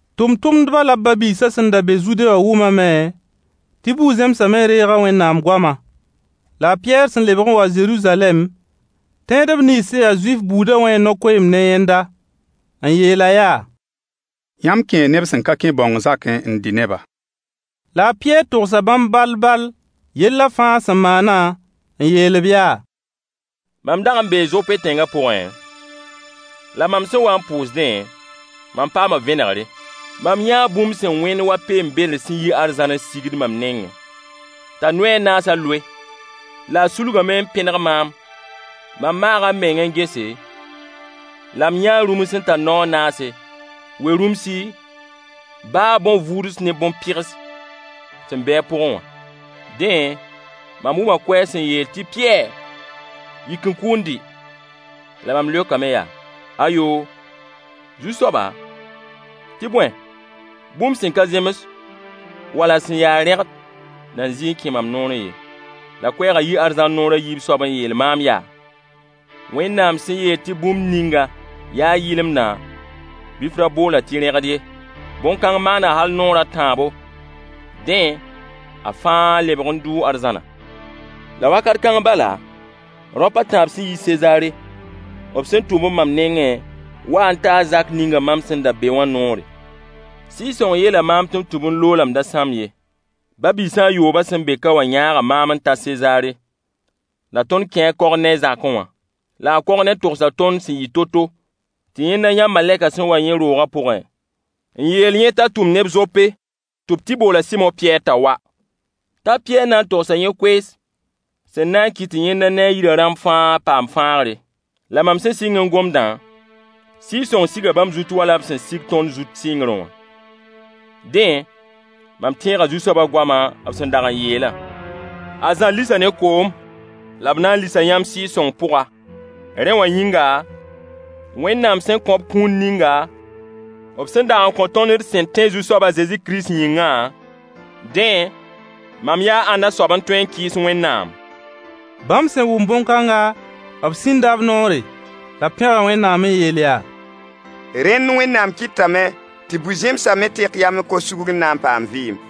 Tʋmtʋmdba la b ba-biisã sẽn da be Zude wã wʋmame tɩ bu-zẽmsã me reega Wẽnnaam goama. La a Pɩyɛɛr sẽn lebg n wa Zeruzalɛm tẽedb nins sẽn ya Zuif buudã wẽe no-koeemd ne yẽnda. N yeel-a yaa: Yãmb kẽe neb sẽn ka kẽ bãong zakẽ n dɩ ne-ba! La a Pɩyɛɛr togsa bãmb ball-ball yellã fãa sẽn maana, n yeel-b yaa: Mam dag n bee Zope tẽngã pʋgẽ, La mam sẽn wa n pʋʋsdẽ, mam paama vẽnegre. Mam yãa bũmb sẽn wẽnd wa peen-bedr sẽn yi arzãn n sigd mam nengẽ t'a noy a naasa loe. La a sulgame n pẽneg maam. Mam maaga m meng n gese la m yãa rũms sẽn tar nao a naase, we-rũmsi, baa bõn-vuuds ne bõn-pɩgs sẽn be a pʋgẽ wã. Dẽ mam wʋma koɛɛg sẽn yeel tɩɩyɛɛr yik n kʋ n dɩ. La mam leokame yaa: Ayo, Zu-soaba, tɩ bõe bũmb sẽn ka zems wala sẽn ya rẽgd na n zɩɩ n kẽ mam noorẽ ye. La koɛɛga yii arzãn naoor a yiib soab n yeel maam yaa: Wẽnnaam sẽn yeel tɩ bũmb ninga yaa yɩlemdã, bɩ f ra bool-a tɩ rẽgd ye. Bõn-kãng maana hal naoor a tãabo, dẽ, a fãa lebg n dʋʋ arzãna. La wakat kãng bala, raop a tãab sẽn yi Sezaare b sẽn tʋm-b mam nengẽ waa n taa zak ninga mam sẽn da be wã noore. Sɩɩg-sõng yeela maam tɩ m tũ-b n loog la m da sãmb ye. Ba-biisã yoobã sẽn be ka wã yãaga maam n ta Sezaare. La tõnd kẽ a Korney zakẽ wã. La a Korney togsa tõnd sẽn yɩ to-to tɩ yẽnda yã malɛkã sẽn wa yẽ rooga pʋgẽ n yeel yẽ t'a tʋm neb Zope tɩ b tɩ bool a Sɩmo Pɩyɛɛr t'a wa. T'a Pɩyɛɛr na n togsa yẽ koees sẽn na n kɩt tɩ yẽnda ne a yirã rãmb fãa paam fãagre. La mam sẽn sɩng n gomdã, Sɩɩg-sõng siga bãmb zut wala b sẽn dag sig tõnd zut sɩngrẽ wã. Dẽ, mam tẽega Zu-soabã goamã b sẽn dag n yeelã: A Zã lisa ne koom la b na n lisa yãmb Sɩɩg-sõng pʋga. Rẽ wã yĩnga, Wẽnnaam sẽn kõ-b kũun ninga b sẽn dag n kõ tõnd d sẽn tẽ Zu-soab a Zezi Kirist yĩngã, dẽ mam yaa ãnna soab n tõe n kɩɩs Wẽnnaam? Bãmb sẽn wʋm bõn-kãnga, b sĩnda b noore. La b pẽga Wẽnnaam n yeel yaa: Rẽnd Wẽnnaam kɩtame tɩ bu-zẽmsã me tek yam n kos sugr n na paam vɩɩm.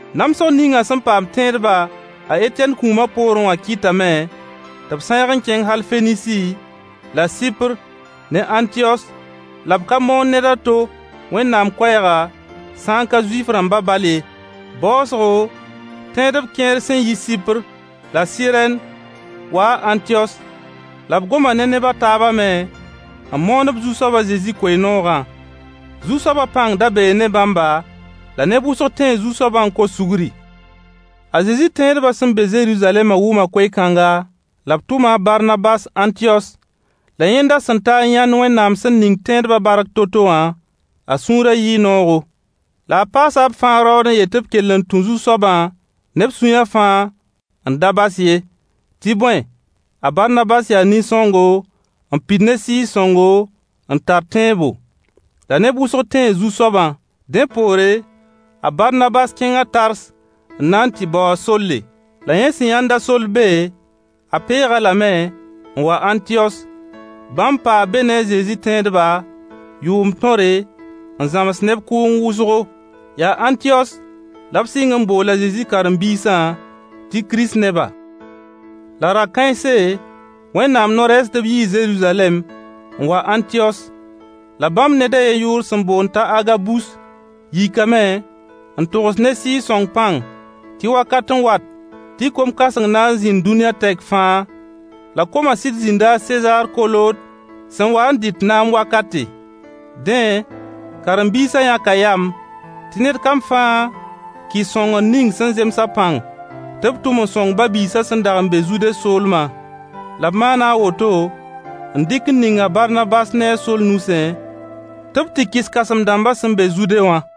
Namsg ninga sẽn paam tẽedba a Etɛn kũuma poorẽ wã kɩtame tɩ b sãeeg n kẽng hal Fenisi, la Sɩpr ne Ãntiyos la b ka moon ned a to Wẽnnaam koɛɛga sã ka Zuif-rãmba bal ye. Baoosgo tẽedb kẽer sẽn yi Sɩpr la Sɩrɛn waa Ãntiyos la b goma ne neb a taabã me n moon-b Zu-soab a Zezi koe-noogã. Zu-soaba pãng da bee ne bãmba la neb wʋsg tẽe Zu-soabã n kos sugri. A Zezi tẽedba sẽn be Zeruzalɛma wʋma koe-kãnga, la b tʋma a Barnabas Ãntiyos. La yẽnda sẽn ta n yãnd Wẽnnaam sẽn ning tẽedba bark to-to wã, a sũurã yɩɩ noogo. La a paasa b fãa raood n yet tɩ b kell n tũ Zu-soabã ne b sũyã fãa n da bas ye. Tɩ bõe, a Barnabas yaa nin-sõngo, n pid ne Sɩɩg-sõngo n tar tẽebo. La neb wʋsg tẽe Zu-soabã. Dẽ poore,a Barnabas kẽnga Tars n na n tɩ bao a Solle. La yẽ sẽn yãnd-a Soll be a peeg-a lame n wa Ãntiyos. Bãmb paa be ne a Zezi tẽedba yʋʋmd tõre n zãms neb kʋʋng wʋsgo. Yaa Ãntiyos la b sɩng n bool a Zezi karen-biisã tɩ Kirist neba. La ra-kãense, Wẽnnaam no-rɛɛsdb yii Zeruzalɛm n wa Ãntiyos. La bãmb ned a yen yʋʋr sẽn boond t'a Agabus yikame n togs ne Sɩɩg-sõng pãng tɩ wakat n wat tɩ kom-kãseng na n zĩnd dũniyã tɛk fãa. La komã sɩd zĩnda a Sezaar Kolood sẽn wa n dɩt naam wakate. Dẽ karen-biisã yãka yam tɩned kam fãa kɩs sõngr ning sẽn zems a pãng tɩ b tʋm n sõng ba-biisã sẽn dag n be Zude soolma. La b maana a woto n dɩk n ning a Barnabas ne a Soll nusẽ tɩ b tɩ kɩs kãsem-dãmba sẽn be Zude wã.